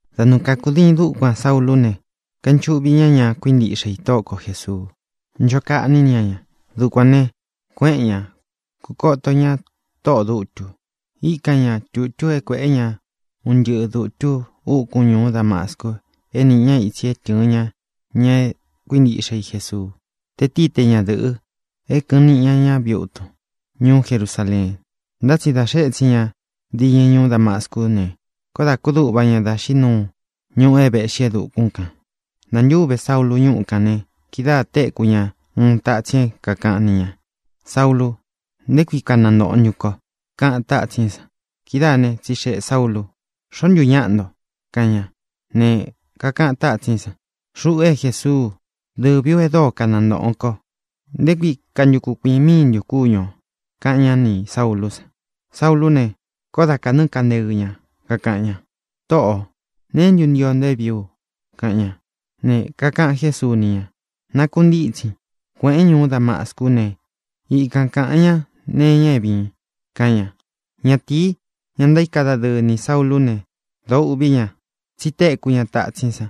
Da nɨɨ kākudiin dukuan Saúlū ne, kainchuꞌvi ñá ña kuíntiꞌxe i Tóꞌo ko Jēsuu, ncho kaꞌní ña ña. Dukuān ne, kuéꞌen ña, kūkoto ñá tóꞌō dutu. Íkan ña tūtú é kuēꞌé ña un ntɨꞌɨ dūtu úkun ñūú Damascu é nīꞌi ña itsi é tɨ̄ɨn ña ña é kuíntiꞌxe i Jesuu, te tíi te ñadɨ̄ꞌɨ, é kɨ̄ꞌɨn niꞌi ña ña viꞌi utun ñuú Jerusaleen. Ntá tsi da xee étsin ña diñɨ ñuú Damascú ne, koó dā kúduꞌva ña dá xiꞌí nuu ñuꞌu é vēꞌxi e dukún kān. Nantúve Saúlu ñuꞌu kān ne, kidáā téku ña uun tatsin é kākaꞌan ni ña: —Saúlū, ¿nté kui kanantōꞌon ntun ko? —kaꞌan tátsín san. Kidáa ne, tsixeꞌē Saúlū: —¿Xoó ntu ñaꞌa nto? —kaꞌan ña. Ne, kakaꞌan tátsín san: —Xuꞌu é Jesuu. Dɨvī ú e dóo kanantōꞌon ko. ¿Nté kui kantukun kuīꞌin míin ntun kúñu ō? —kaꞌan ñá nī Saúlū san. Saúlū ne, koó da kānɨ́ꞌɨ kanteɨ ña, kakaꞌan ña: —Tōꞌo, ¿neé ntu ntio nto é vīí u? —kaꞌan ña. Ne, kakaꞌan Jésuu ni ña: —Nakuntítsin, kuēꞌén ñuú Damascú ne, ikan kāꞌan ñá nee iña é vīin —kaꞌan ña. Ñatīi, ña ntaíka dadɨɨ nī Saúlū né, dōo úꞌvī ña, tsí téku ña tatsín san,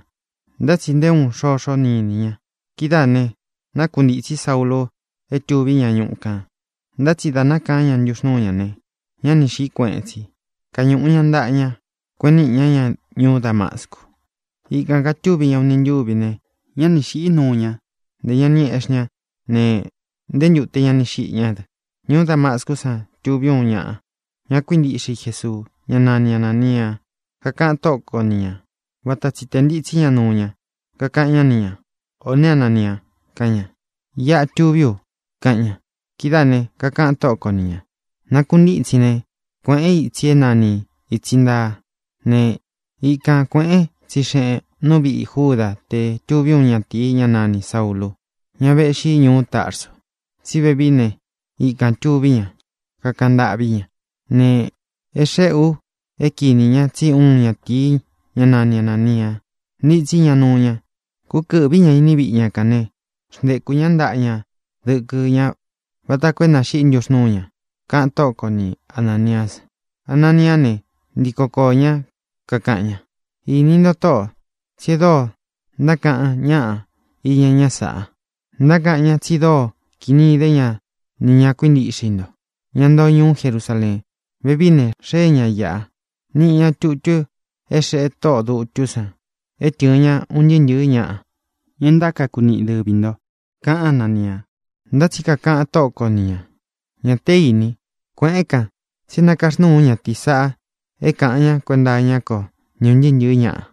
ntá tsi nté uun xoxo ni iní ña. Kidáā ne, nákuntītsí Saúlū é tūví ña ñuꞌu kān. Ntá tsi dā nákaán ña ntuxnúu ña ne, ñá ni xīꞌí kueꞌen tsi. Kañūꞌu ña ntaꞌa ña, kueꞌen níꞌi ña ña ñuú Damascu. Ikān katúvi ña uni ntúvi ne, ñá ni xīꞌí nuu ña; ntē ña ni eꞌxí ña ne, nté ntūte ña ni xiꞌi ñá dɨ. Ñuú Damascú san tuví uun ñaꞌa ña kuíntiꞌxe i Jesuu, ñá nani Anānia. Kakaꞌan Tóꞌo ko ni ñā, vata tsi tē ntitsí ña nuu ña, kakaꞌan ñá ni ñā: —¡Ō né, Anania! —kaꞌan ña. —Iꞌa tuví u —kaꞌan ña. Kidáā ne, kakaꞌan Tóꞌo ko ni ñā: —Nakuntítsin ne, kuēꞌén itsi é nani Ītsi Ntaa. Ne, ikan kuēꞌén, tsixeꞌēn nú viꞌi Júda te tuví uun ñatīi, ñá nanī Saúlū, ñá vēꞌxi ñuú Tarsu. Tsí vevií ne, ikān tuví ña, kakaꞌan ntâꞌví ña. Ne, é xéꞌe ú é kinī ñá tsí uun ñatīi, ñá nani Anānia, ntitsí ña nuu ña, kúkɨ̄ꞌví ña iní viꞌi ña kān né, xntekū ñá ntaꞌa ña dɨkɨ ñá vata koo é nāxiꞌí ntuxnúu ña —kaꞌan Tóꞌo ko ni Anāniá san. Ananiá ne, ntíko koō ñá, kakaꞌan ña: —Ini ntó, Tóꞌō, tsí é dóo ntákaꞌan ñaꞌa iña ñá sāꞌa. Ntákaꞌan ñá tsi dóo kini idé ña ni ña kuíntiꞌxe i nto, ña ntoo ñuú Jerusaleen. Vevií ne, xee ña iꞌa, niꞌi ña tutú é xeꞌe tóꞌō dutú san é tɨ̄ɨn ña un ntɨɨ́ ntɨ̄ɨ́ ñaꞌa, ña é ntákaku niꞌi dɨvī nto —kaꞌan Ánania. Ntá tsi kakaꞌan Tóꞌo ko ni ñā: —Ña té īni. Kueꞌēn kán, tsi é nakaxnúu ú ñatīí saꞌa é kāꞌan ña kuenta iñá ko ni ūn ntɨɨ́ ntɨ̄ɨ́ ñaꞌa,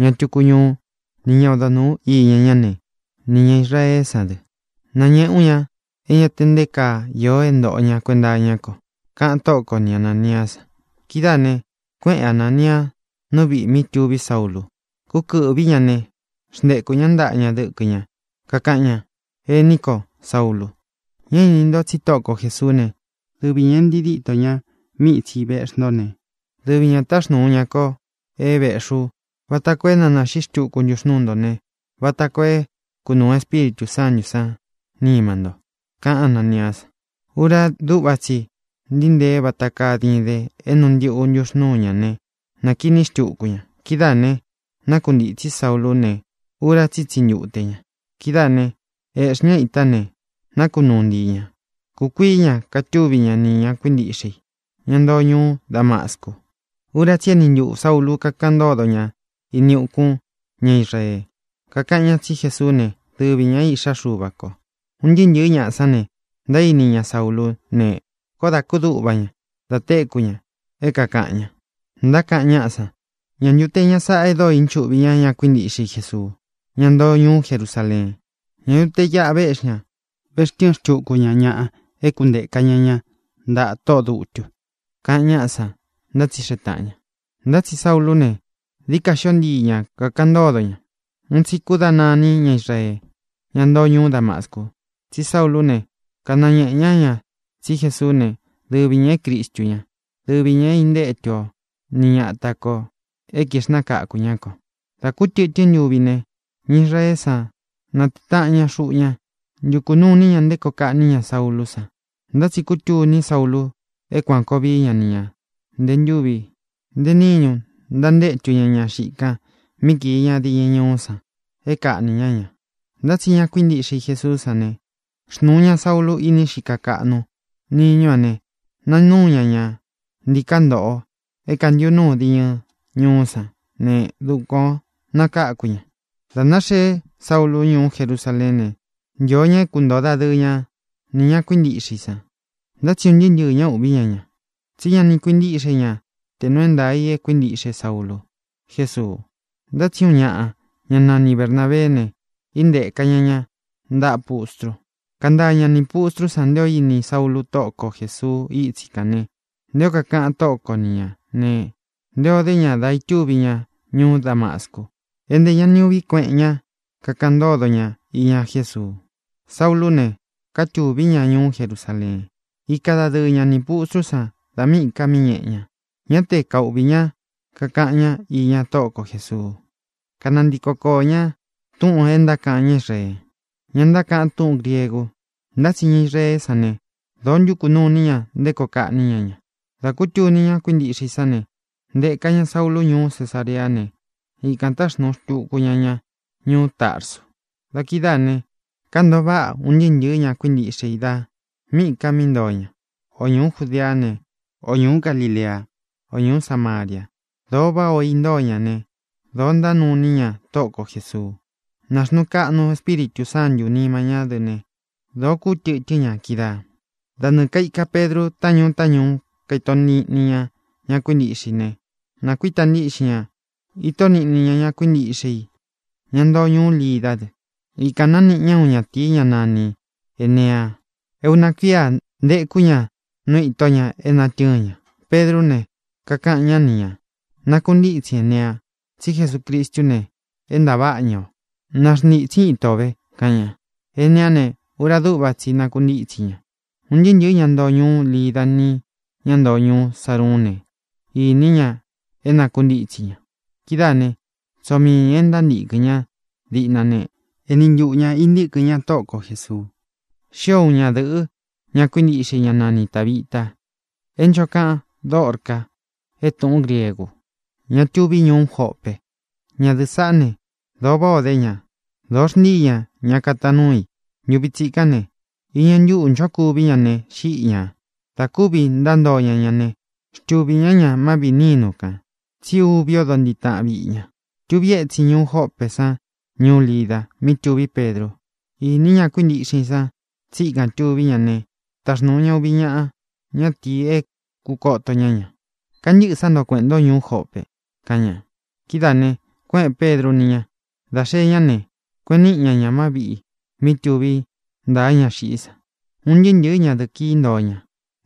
ña túku ñuú, ni ña odo nūu íña ñá ne, nī ña Israeé san dɨ. Nañēꞌé u ña é ña te nté kaa īó é ntōꞌo ña kuenta iñá ko —kaꞌan Tóꞌo ko ni Anāniá san. Kidáā ne, kuéꞌen Anānia nú viꞌī mí tuví Saúlū. Kúkɨ̄ꞌví ña ne, xntekū ñá ntaꞌa ña dɨkɨ ña, kakáꞌan ña: —Ení ko, Saúlū, ña ini nto tsí Tóꞌo ko Jēsuú ne, dɨvi ñā é ntii dítō ña míꞌi ītsi véꞌxi nto ne, dɨvi ñā táxnūu ña ko é vēꞌxi ú vata koo é na nāxiꞌí xtuku ntuxnūú nto ne, vata koo é kunūu Espíritū Sántū san nima nto —kaꞌan Ánaniá san. Ura dúꞌva tsi i ntíi ntee vata kaa diden é nuu ntiꞌu ntuxnúu ña ne, nākiní xtuku ña. Kidáā ne, nákuntītsí Saúlū ne, ura tsí i ítsi ntute ña. Kidáā né, ēꞌxí ña ita ne, nakunúu ntii ñā. Kūkuií ña katúvi ña ni ñā kuíntiꞌxe i, ña ntoo ñuú Damascu. Ura tsí i eni ntuꞌū Saúlu kākaꞌan ntódo ña ini ukún ña Israee, kákaꞌan ñá tsí Jesuú ne, dɨvi ñā é Iꞌxá Xuva kō. Un ntɨɨ́ ntɨ̄ɨ́ ñaꞌa san ne, ntaíni ña Saúlū ne, koó dā kúduꞌva ña da téku ña é kākaꞌan ña. Ntákaꞌan ñáꞌa san: —¿Ñā ntu te ñá sāꞌa e dóo inchuꞌvi ña ña kuíntiꞌxe Jesuu, ñá ntoo ñuú Jerusaleen? ¿Ñā ntu te iꞌa véꞌxi ña, vextɨɨn xtuku ña ñaꞌa é kūnteka ña ña ntaꞌa tóꞌō dutu? —kaꞌan ñáꞌa san, ntátsixeꞌe tāꞌan ña. Ntá tsi Saúlū ne, dií ka xio ntii ña kakaꞌan ntódo ña. Un tsi kúdana iní ña Israee, ñá ntoo ñuú Damascu, tsí Saúlū ne, kanañēꞌe ña ña tsí Jesuú ne, dɨvi ñā é Cristu ñá, dɨvi ñā é intétu o ni ñata kō é kixnakakū ñá kō. Dā kú tɨtɨ́n ntuvi ne, ña Israeé san natée taꞌan ña xuꞌu ña, ntukū nuu iní ña nté koo kaꞌní ña Saúlū san. Ntá tsi kútuní Saúlū é kuān koo vií ña ni ñā. Ntē ntúvi, ntē níñu ntantétu ña ña xiꞌi kan mí kīi ña diñɨ ñuú san, é kaꞌnī ñá ña. Ntá tsi ña kuíntiꞌxe i Jesuú san ne, xnūu ña Saúlu īni xika kaꞌnu niñú a ne, nanúu ña ña ntīká ntoꞌo é kāntiꞌu núu diñɨ ñuú san ne, dukuan ō nakáku ña. Dā náxeé Saúlu ñūú Jerusaleén ne, ntio ña é kuntoo dadɨɨ ña nī ña kuíntiꞌxe i san; ntá tsi un ntɨɨ́ ntɨɨ̄ ña úꞌvī ñá ña, tsí ña ni kuintíꞌxe ña te nūu é ntaā i é kuíntiꞌxe Saúlu Jēsuu. Ntá tsi uun ñaꞌa, ñá nani Bernābeé ne, intéka ña ña ntaꞌa pustru, kántaa ña nī pustrú san nté ō íni Saúlū Tóꞌo ko Jēsuu ítsi kān ne, nté ō kakaꞌan Tóꞌo ko ni ñā ne, nté ō dé ña da itúvi ña ñuú Damascu, é ntē ña ni uꞌví kueꞌen ña kakaꞌan ntódo ña iña Jésuu. Saúlū ne, kátūví ña ñuú Jerusaleen, ika dadɨɨ ña nī pustrú san da míꞌī ká mí ñēꞌe ña. Ñá te kauꞌvī ñá kakaꞌan ñá iña Tóꞌo ko Jēsuu, kánantiko koō ñá túꞌūn é ntákaꞌan ña Israee, ñá ntákaꞌan túꞌūn griegu; ntá tsi ña Israeé san ne, dōo ntuku nuu ini ña nté koo kaꞌní ña ña. Dā kútuni ña kuíntiꞌxe i sán ne, ntēka ña Saúlu ñūú Cesareá ne, ikān táxnuu tuku ña ña ñūú Tarsu. Da kidáā ne, kántōo váꞌa un ntɨɨ́ ntɨ̄ɨ́ ña kuíntiꞌxe i da míꞌī ka mí ntoo ña: ō ñuú Judeá ne, ō ñuú Galilea, ō ñuú Samaria. Dōo váꞌa ō intóo ña ne, dōo ntánuu iní ña Tóꞌo ko Jēsuu. Nāxnuu kaꞌnu Espíritū Sántū nima ñá dɨ ne, dōo kútɨtɨ́n ña kídaā. Da nɨɨ̄ kaika Pedru taꞌán ñuu taꞌán ñuú, kaito níꞌni ña ña kuíntiꞌxe i ne, nakuíta ntíꞌxin ña, íto niꞌni ña ña kuíntiꞌxe i, ña ntoo ñuú Lidá dɨ. Ikān nániꞌi ña uun ñatīi, ñá nani Ēnea. E una kuía ntēkú ña nú ītó ña é natɨ́ɨn ña. Pedrú ne, kakaꞌan ñá ni ñā: —Nakuntítsin, Enea, tsí Jesucristú ne, é ntāváꞌa ña o. Naxntītsin íto o vē —kaꞌan ña. Eneá ne, ura dúꞌva tsi i nakuntítsi ña. Un ntɨɨ́ ntɨ̄ɨ́ ña ntoo ñuú Lida ni ñá ntoo ñuú Saruún ne, iní ña é nakuntítsi ña. Kidáā né, tsoo mii ñā é ntántīkɨn ña díꞌna ne, eni ntuꞌu ñā intíkɨn ña Tóꞌo ko Jēsuu. Xío uun ñadɨ̄ꞌɨ, ña kuíntiꞌxe i, ñá nani Tābita (é ncho kaꞌan Dórcā é tūꞌún griegu), ña tuví ñuú Jope. Ñadɨ̄ꞌɨ́ saꞌá ne, dōo váꞌā o dé ña, dōo xntíi ña ña kataan núu i. Ntuvi tsikán ne, iñɨ ntúꞌū nchókuví ña ne, xíꞌi ñā. Dā kúvī ntántoo ña ña ne, xtuvī ñá ña má viꞌī nínu kān, tsí ūvi odo ntiꞌi táꞌan viꞌi ña. Tuvi étsin ñuú Jopé san ñuú Lida, mí tuví Pedru. Īní ña kuíntiꞌxe i san tsí ikān tuví ña ne, táxnūu ña uvi ñaꞌa ñátīi é kūkoto ña ña: —Kantɨ́ꞌɨ̄ sá nto kueꞌēn ntó ñuú Jope —kaꞌan ña. Kidáā ne, kuéꞌēn Pedru ni ña. Dā xee ñá ne, kueꞌen níꞌi ña ña má viꞌī mí tūví ntāa ñá xiꞌí san. Un ntɨɨ́ ntɨ̄ɨ́ ñadɨ̄ꞌɨ kií ntoo ña,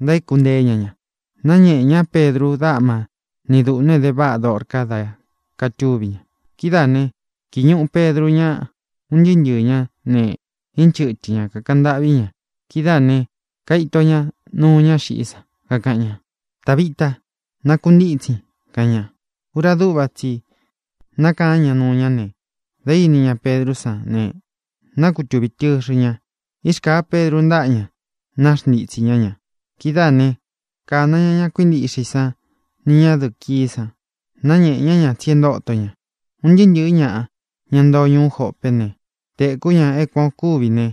ntaéku nteé ña ña. Náñēꞌe ñá Pedru dáꞌma ni dūꞌnu e dé váꞌa Dórcā dá katúvi ña. Kidáā né, kīi ñuꞌu Pedru ñá, un ntɨɨ́ ntɨɨ̄ ñá ne, inchɨ́tɨ ña, kakaꞌan ntâꞌví ña. Kidáā ne, kaito ña nuu ñá xiꞌí san, kakaꞌan ña: —¡Tābita! ¡Nakuntítsin! —kaꞌan ña. Ura dúꞌva tsi i nákaán ña nuu ña ne, dā íni ña Pedrú san ne, nákutuvī tɨxɨ ña. Irkāa Pedru ntáꞌa ña, naxntitsī ñá ña. Kidáā ne, kána ña ña kuíntiꞌxe i san ni ñadɨ̄ꞌɨ kií san, náñēꞌe ñá ña tsi e ntóto ña. Un ntɨɨ́ ntɨ̄ɨ́ ñaꞌa, ña ntoo ñuú Jopé ne, téku ña é kuan ō kúvi ne,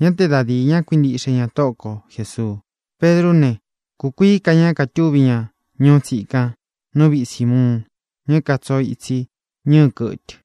ñá te da dīi ña kuíntiꞌxe ña Tóꞌo ko Jēsuu. Pedrú ne, kūkuií ka ña katúvi ña ñuú tsikan nú viꞌi Sīmuun, ña é katsoo itsi ñɨɨ kɨtɨ.